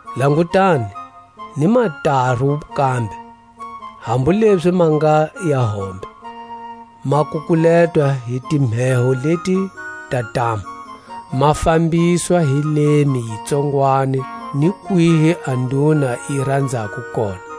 Langutani, ni mataru kambe, hambu lezi ma nga ya hombe, ma kukuletwa hi timheho leti ta ntamu, ma fambiswa hi lemi yi tsongwani ni kwihi a nduna yi ranzako kona.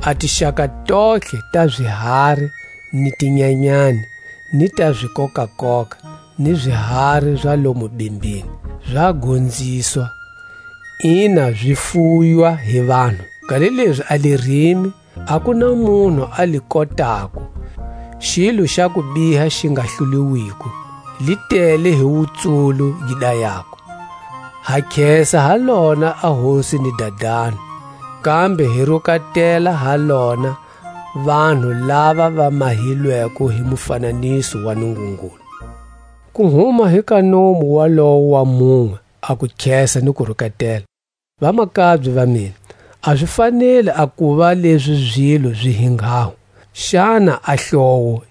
A tixaka tontlhe ta zihari ni tinyanyani, ni ta zikokakoka, ni zihari za lomu bimbini, za gonziswa, ina zi fuywa hi vanhu, kanilezi a lirimi, a ku na munhu a li kotako; xilo xa kubiha xi nga hluliwiko, li tele hi wutsulu gi dayako. Ha khesa ha lona a Hosi ni Dadani; kambe hi rukatela ha lona vanhu lava va mahilweko hi mufananiso wa Nungungulu. Ku huma hi ka nomu walowo wa munwe a kukhesa ni kurukatela. Vamakabye va mina, a zi faneli a kuva lezi zilo zi hi nghaho. Xana a hlowo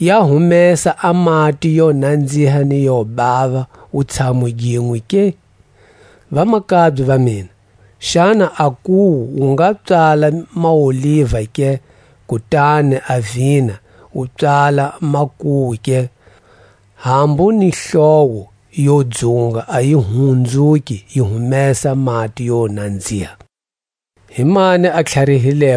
ya humesa a mati yo nanziha ni yo bava wutshamu ginwe ke? Vamakabye va mina, xana a nkuwu wu nga pswala maoliva ke, kutani a vina wu pswala makuwu ke? Hambu ni hlowo yo dzunga a yi hunzuki yi humesa mati yo nanziha. A wutlhari gi tako hi le hehla.